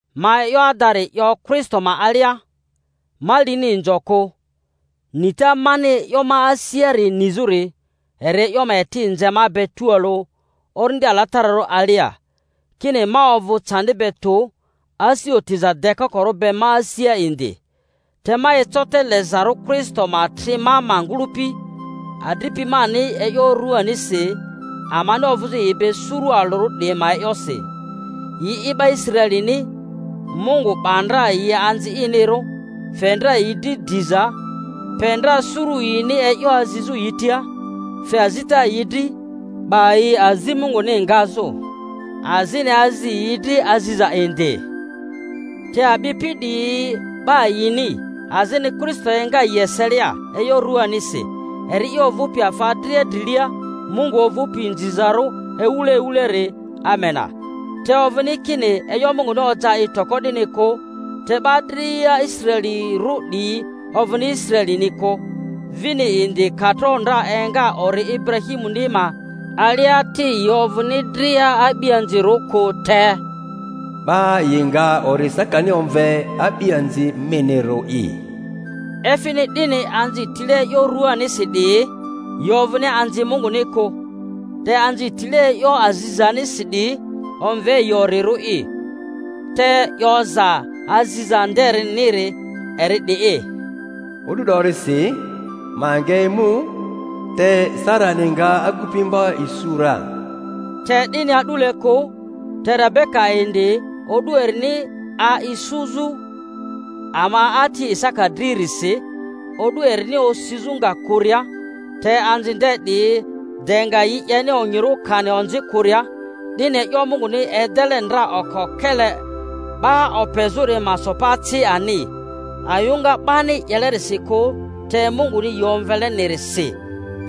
Ma e'yo adari 'yo Kristo ma alia.. ma lini inzo kᴜ; nita mani e'yo ma asiari nizᴜri eri e'yo ma eti nze ma be tualᴜ Orindi Alatararᴜ alia, kini, ma ovᴜ candi be tᴜ asi otiza dekokorᴜ be ma asia indi. Te ma eco te lezarᴜ Kristo ma tri ma ma ngᴜlᴜpi, adripi mani e'yo ruanisi, amani ovᴜzᴜ yi be suru alᴜri 'diyi ma e'yosi. Yi'i 'ba Israelini, Mungu 'ba ndra yi anzi inirᴜ, fe ndra yi dri diza, pe ndra suru yini e'yo azizᴜ yi tia, fe azita yi dri, 'ba yi azi Munguni ngazᴜ, azini azi yi dri aziza indi; te a'bipi 'diyi 'ba yini, azini Kristo enga yi eselia e'yo ruanisi, eri'i ovᴜpi afa dria drilia, Mungu ovᴜpi inzizarᴜ ewule ewuleri. Amena. Te ovᴜni kini e'yo Munguni oja i toko 'dini kᴜ. Te 'ba dria Israelirᴜ 'diyi ovᴜni Israelini kᴜ, vini indi ka tro ndra enga ori Iburahimuni ma alia ti yi ovᴜni dria a'bianzirᴜ kᴜ; te, 'Ba yi nga ori Isakani omve a'bianzi minirᴜ'i. Efini 'dini, anzi tile e'yo ruanisi 'diyi yi ovᴜni anzi Munguni kᴜ, te anzi tile e'yo azizanisi 'diyi, omve yi orirᴜ'i. Te 'yoza aziza ndeniri eri 'di'i, O'du 'dorisi ma nga emu, te Sarani nga agupimva isu ra. Te 'dini a'dule kᴜ, te Rebeka indi o'du erini 'a isuzᴜ ama ati Isaka dririsi, o'du erini osizᴜ nga kᴜria, te anzi nde 'diyi de nga yi 'yeni onyirᴜ kani onzi kᴜria, 'dini e'yo Munguni edele ndra oko-kele 'ba opezᴜri ma so pa ci ani, ayᴜŋa 'bani 'yelerisi kᴜ te Munguni yi omvelenirisi,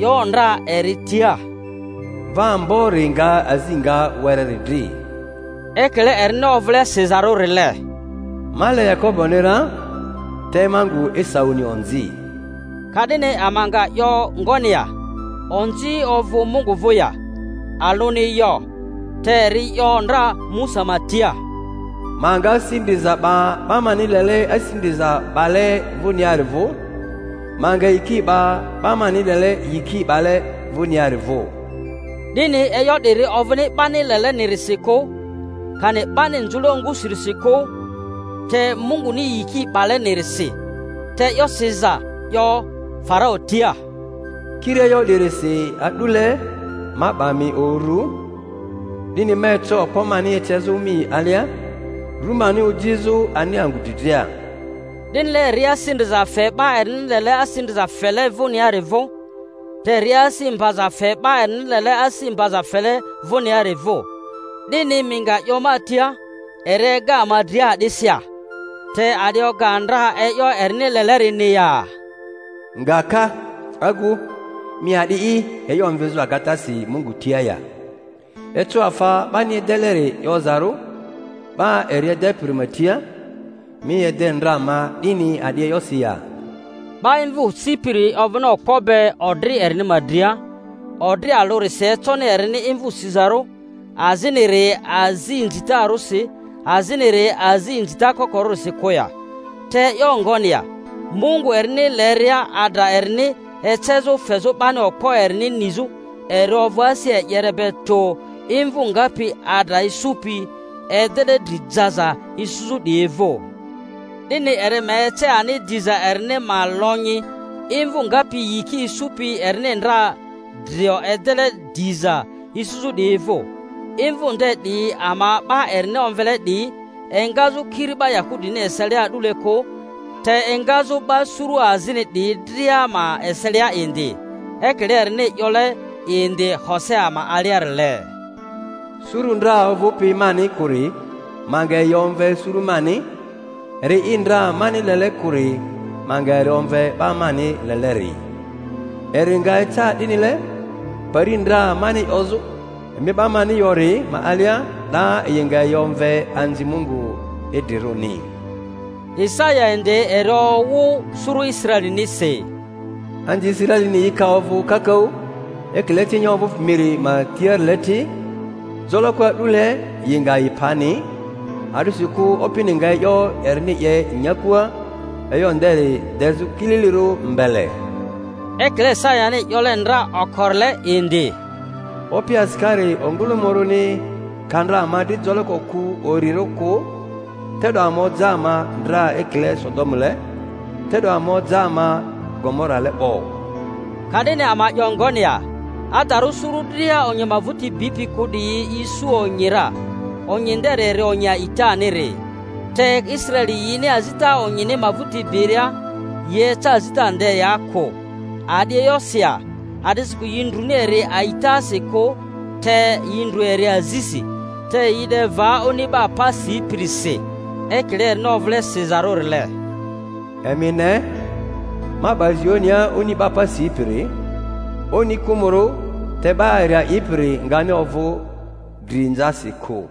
'yo ndra eri tia, Mva ambori nga azi nga wereri dri. Ekile erini ovᴜle sizarᴜrile, Ma le Yakoboni ra, te ma ngu Esauni onzi. Ka'dini ama nga 'yo ngoni ya? Onzi ovᴜ Mungu vᴜ ya? Alᴜni yo! Te eri 'yo ndra Musa ma tia, Ma nga asi ndriza 'ba 'ba mani lele asi ndriza 'bale vᴜniari vᴜ, ma nga yiki 'ba 'ba mani lele yiki 'bale vᴜniari vᴜ. 'Dini e'yo 'diri ovᴜni 'bani lelenirisi kᴜ, kani 'bani nzᴜle ongusinirisi kᴜ, te Munguni yiki 'balenirisi. Te e'yo siza 'yo Farau tia, Kiri e'yo 'dirisi a'dule ma 'ba mi uru, 'dini ma eco okpo mani ecezᴜ mi alia, ru mani ojizᴜ ani angᴜ dri dria. 'Dinile eri asi ndriza fe 'ba erini lele asi ndriza fele vᴜniari vᴜ, te eri asi mbaza fe 'ba erini lele asi mbaza fele vᴜniari vᴜ. 'Dini mi nga 'yo ma tia, Eri ega ama dria a'disi ya? Te a'di oga ndra e'yo erini lelerini ya? Nga ka, agu, mi a'di'i e'yo omvizᴜ agatasi Mungu tia ya? Eco afa 'bani edeleri 'yozarᴜ 'ba eri edepiri ma tia, Mi ede ndra ma 'dini a'di e'yosi ya? 'Ba imvᴜ sipiri ovᴜni okpo be odri erini ma dria, odri alᴜrisi econi erini imvᴜ sizarᴜ, aziniri azi inzitarᴜsi, aziniri azi inzita kokorᴜsi kᴜ ya? Te e'yo ngoni ya? Mungu erini leria adra erini ecezᴜ fezᴜ 'bani okpo erini nizᴜ, eri ovᴜ asi e'yere be tᴜ imvᴜ ngapi adra isupi edele dri jaza isuzᴜ 'diyi vᴜ. 'Dini eri ma ece ani diza erini ma lonyi imvᴜ ngapi yiki isupi erini ndra drio edele diza isuzᴜ 'diyi vᴜ. Imvᴜ nde 'diyi ama 'ba erini omvele 'diyi, engazᴜ kiri 'ba Yahudini eselia a'dule kᴜ, te engazᴜ 'ba suru azini 'diyi dria ma eselia indi. Ekile erini 'yole indi Hosea ma aliarile, Suru ndra ovᴜpi mani kᴜri ma nga yi omve suru mani, eri'i ndra mani lele kᴜri ma nga eri omve 'ba mani leleri. Eri nga eca 'dinile, pari ndra mani 'yozᴜ, Emi 'ba mani yori, ma alia, 'da yi nga yi omve anzi Mungu idrirᴜni. Isaya indi eri owᴜ suru Israelinisi: Anzi Israelini yi ka ovᴜ kakaᴜ ekile cinya ovᴜpi miri ma tiarile ti, joloko a'dule yi nga yi pani; a'disikᴜ Opini nga e'yo erini 'ye nyakua, e'yo nderi dezᴜ kililirᴜ mbele. Ekile Isayani 'yole ndra okorile indi, Opi asikari ongᴜlᴜmᴜrᴜni ka ndra ama dri joloko kᴜ orirᴜ kᴜ, te'do ama oja ama ndra ekile Sodomule, te'do ama oja ama Gomorale 'bo. Ka'dini ama 'yo ngoni ya? Adarᴜ suru dria onyi ma vᴜti bipi kᴜ 'diyi yi isu onyi ra, onyi nderi eri onyi alitaniri. Te Israeli, yini azita onyini ma vᴜti biria, yi eca azita ndea kᴜ. A'di e'yosi ya? A’disikᴜ yi ndrᴜni eri a'itasi kᴜ, te yi ndrᴜ eri azisi. Te yi 'de va oni 'ba pa sipirisi, ekile erini ovule siza-rᴜrile, Emi ne, ma 'ba Zionia oni 'ba pa sipiri, oni kᴜmᴜrᴜ; te 'ba eri a'ipiri ngani ovᴜ dri-nzasi kᴜ.